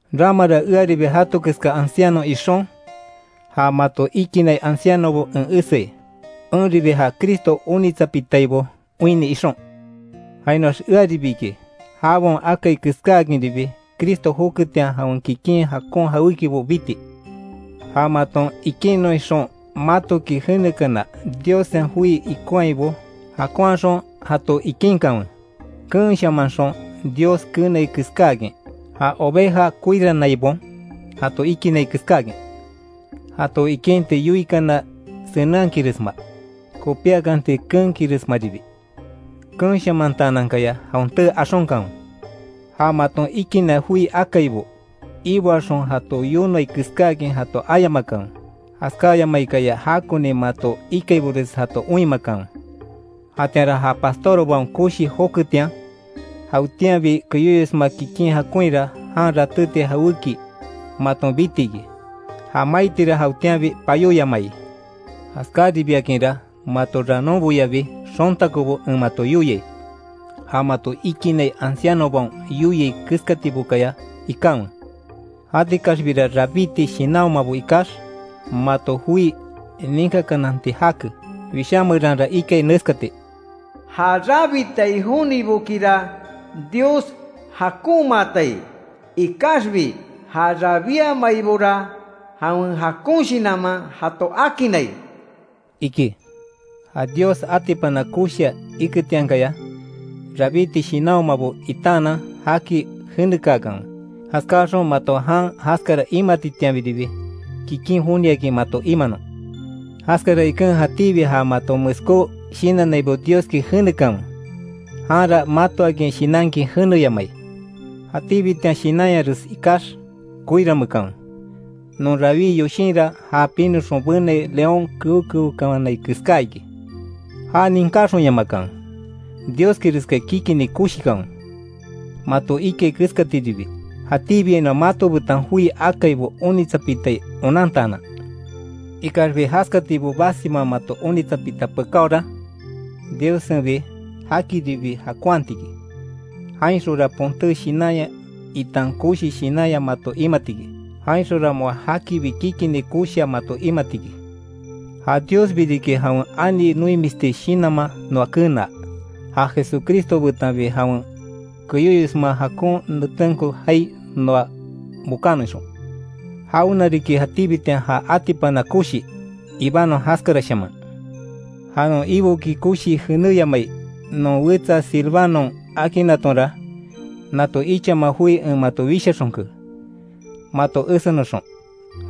Ramara earibi jato keska anciano ixon, ja mato ikinai ancianobo en eseai; enribi ja Cristo onitsapitaibo oinni ixon. Jainoax earibi iki, jabaon akai keskáakinribi Cristo joketian jawen kikin jakon jawékibo biti. Ja maton ikinnon ixon matoki jenekana Diossen joi ikonhaibo jakonhaxon jato ikinkanwe. Keenshamanxon Dios keenai keskáakin; ja oveja koirannaibaon jato ikinai keskáakin. Jato ikinti yoikana senenhakinresma, kopíakanti keenkinresmaribi, keenshamantaanankaya jawen tee axonkanwe. Ja maton ikinai joi akaibo, iboaxon jato yonoai keskáakin jato ayamakanwe, jaskáyamaikaya jakoni mato ikaibores jato oinmakanwe. Jatianra ja pastorbaon koshi joketian, jawetianbi keyóyosma kikin jakonhira jan ratéti jawéki maton biti iki, ja maitira jawetianbi payóyamai. Jaskáribiakinra mato ranonboyabi xontakobo en mato yoiai, ja mato ikinai ancianobaon yoiai keskatibokaya ikanwe. Jatikaxbira rabíti shinanhomabo ikax mato joi ninkakananti jake. Wishá meranra ikai neskati: “Ja rabitai jonibokira Dios jakonmaatai, ikaxbi ja rabiamaibora jawen jakon shinanman jato akinnai”, iki. Ja Dios atipana koshia iketiankaya, rabíti shinanhomabo itaanan jaki jenekaakanwe. Jaskáxon mato jan jaskara imatitianbiribi, kikin joniakin mato imanon. Jaskara iken jatíbi ja maton meskó shinannaibo Dioski jenekanwe, janra matoakin shinankin jeneyamai. Jatíbitian shinanyares ikax koiranmeekanwe, non rawí yoshinra ja pinoxon benai león keo keokawanai keská iki. Já ninkáxonyamakanwe; Dioskireskaya kikini koshikanwe; mato ikai keskatiribi, jatíbiainoa mato betan joi akaibo onitsapitai onantaanan. Ikaxbi jaskatibo basima mato onitsapita pekaora, Diossenbi jakiribi jakonhati iki, jainxonra ponté shinanya itan koshi shinanya mato imati iki; jainxonra moa jakibi kikini koshia mato imati iki. Ja Diosbi riki jawen ani noimisti shinanman noa kenaa, ja Jesucristo betanbi jawen keyóyosma jakon netenko jaai noa bokanon ixon. Jawena riki jatíbitian ja atipana koshi, ibanon jaskarashaman. Ja non Iboki koshii jenéyamai non wetsa Silvanon akinnatonra, nato ichama joi en mato wishaxonke, mato ésenoxon;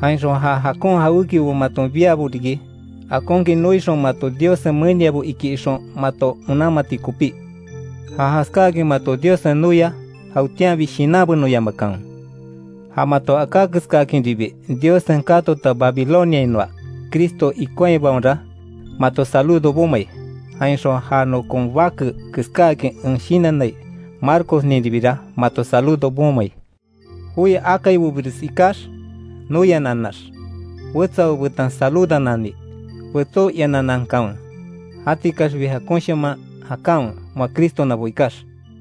jainxon ja jakon jawékibo maton biabo riki, akonkin noixon mato Diossen meniabo iki ixon mato onanmati kopí. Ja jaskáakin mato Diossen noia, jawetianbi shinanbenoyamakanwe. Ja mato aká keskákinribi Diossen katota Babiloniainoa Cristo ikonhaibaonra, mato saludo bomai, jainxon ja nokon bake keskáakin en shinannai Marcosninribira mato saludo bomai. Joi akaibobires ikax, noiananax wetsabo betan saludanani, betsó iananankanwe. Jatikaxbi jakonshaman jakanwe moa Cristonabo ikax.